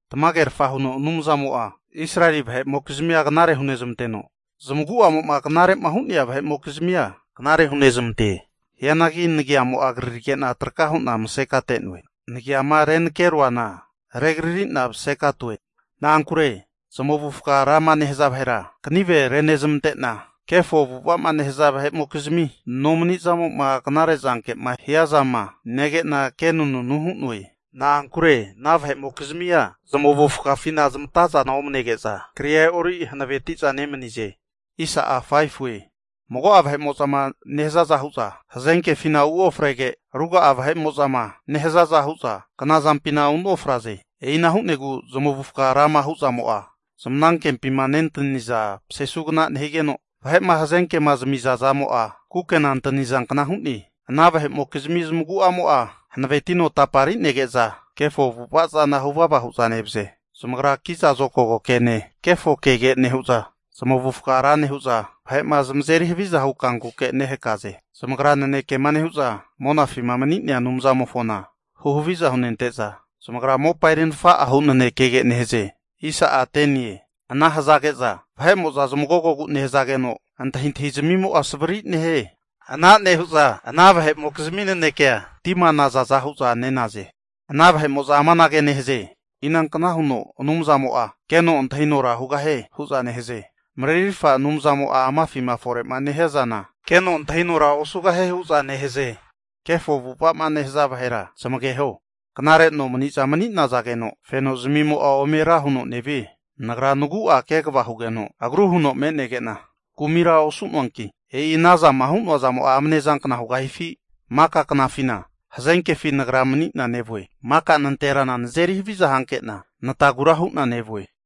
Tamagerfa huno Anumzamo'a Israeli vahe'mokizmia knare hunezmanteno, zamagu'amo'ma agruma hu'nea vahe'mokizmia knarera hunezamante. Hianagi nagiamo'a krarige'na traka hu'na masekate'noe. Nagiama renakeroana regaririna masekatoe. Na'ankure zamavufaga rama nehaza vahera kanive renezmante'na, kefo avu'ava'ma nehaza vahe'mokzimi nomanizamo'ma knare zanke'ma hia zama nege'na, kenanunu hu'noe. Na'ankure ana vahe'mokizmia zamavufagafina zamatazana omanege'za, kria e'ori hanaveti'za nemanize. Mago'a vahe'mo'zama nehazaza hu'za hazenkefina uofrege, ruga'a vahe'mo'zama nehazaza hu'za knazampina unofraze. E'ina hu'negu zamavufaga rama hu' zamo'a, zmanankempima nentaniza pasesugna nehigeno, vahe'ma hazenkema zamizamo'a kukena antanizankna hu'ne. Ana vahe'mokizmi zamagu'amo'a hanavenetino tapari'nege'za kefo avu'ava zana huvava hu'za nevaze. Zamagra kiza zokago kene kefo kege nehu'za, zamavufaga ra nehu'za vahe'ma zamazeri haviza hu kankuke nehakaze. Zamagrama nanekema nehu'za monafima mani'naza vahera huhaviza hunezmante'za, zamagra mopa eri nafa'a hu nanekege nehaze. Ana hazage'za zamagogogu nehazageno, antahintahi zmimo'a savri nehie. Ana nehu'za ana vahe'mokizmi nanekea tima nazaza hu'za nenaze. Ana vahe'mo'za amanage nehaze, inankna huno Anumzamo'a keno antahinora hugahie? hu'za nehaze. Marerirfa Anumzamo'a amafima fore'ma nehia zana, keno antahinora osugahie hu'za nehaze. Kefo avu'ava'ma nehaza vahera zamageho, knare nomani'za mani'nazageno fenozmimo'a ome ra huno nevie. Nagra nagu'a kegava hugeno agru huno me'negena, kumira osu'noanki, e'i ana zama hu'noa zamo'a amnezankna hugahifi? Maka knafina hazenkefi nagra mani'na nevue, maka nanterana nazeri haviza hankena natagura hu'na nevue.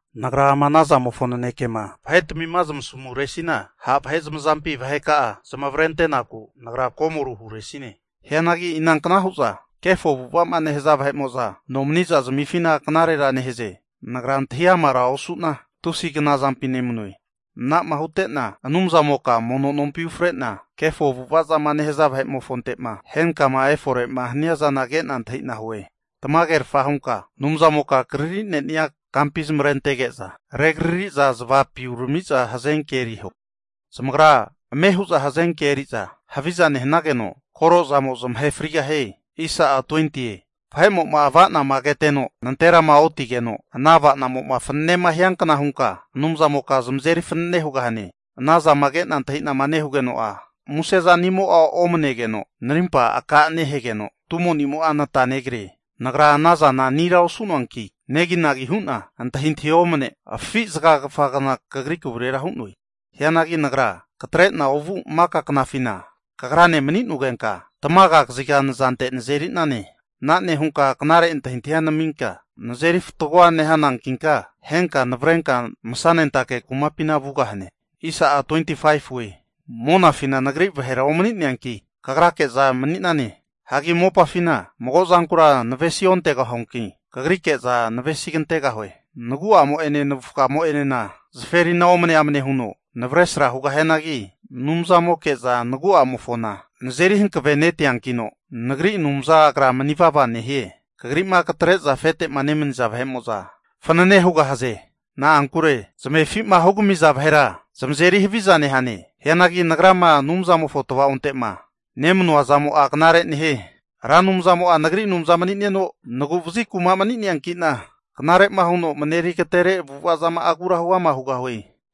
Nagra ama anazamofo nanekema vahetmima zamasamuresina, ha' vahe zamazampi vaheka'a zamavarente'naku nagra komoru huresine. Hianagi inankna hu'za kefo avu'ava'ma nehaza vahe'mo'za, nomaniza zamifina knarera nehaze. Nagra antahi amara osu'na, tusi knazampi nemanue. Ana'ma hute'na Anumzamoka mono nompima ufre'na, kefo avu'ava'ma nehaza vahe'mofonte'ma henkama efore'ma hania zana ke'na antahi'na hue. Tamagerfa hunka Anumzamoka krari'nenia kampi zamavarentege'za rekrari'za zavapi urami'za hazenke eriho. Zamagra ame hu'za hazenkea eri'za haviza nehanageno, korozamo zamahe frigahie. Vahe'mo'ma ava'nama keteno nanterama otigeno, ana ava'namo'ma fanenema hiankna hunka Anumzamoka zamazeri fanenema hugahane! Ana zama ke'na antahi'nama nehugeno'a, musezanimo'a omanegeno narimpa aka nehegeno, tumo'nimo'a natagri'ne. Nagra ana zana anira osu'noanki, neginagi hu'na antahintahi'a omne afi zaga kafagna kagri kavurera hu'noe. Hianagi nagra katre'na ovu maka knafina kagrane mani'nogenka, tamaga kaziga nazante nazeri'nane. Ana nehunka knare antahintahi naminka, nazeri fatgo nehanankinka, henka navrenka masanentake kumapina vugahane. Monafina nagri vahera omani'neanki, kagrake'za mani'nane. Hagi mopafina mago zankura navesi ontegahuanki, kagrike'za navesi kantegahue. Nagu'amo'ene navufgamo'enena zaferina omne amne huno navresra nehianagi Anumzamoke'za nagu'amofona nazeri hankavenetiankino, nagri Anumza Agra mani vava nehie. Kagri'ma katre'za afetema nemaniza vahe'mo'za fanane hugahaze. Na'ankure kamefi'ma hugamiza vahera zamazeri haviza nehane. Hianagi nagrama Anumzamofo tvaonte'ma nemanua zamo'a knare nehie. Ra Anumzamo'a nagri Anumza mani'neno, nagu vazi kuma mani'neankina, knare'ma huno mareri agatere avu'ava zama'agura huama hugahue.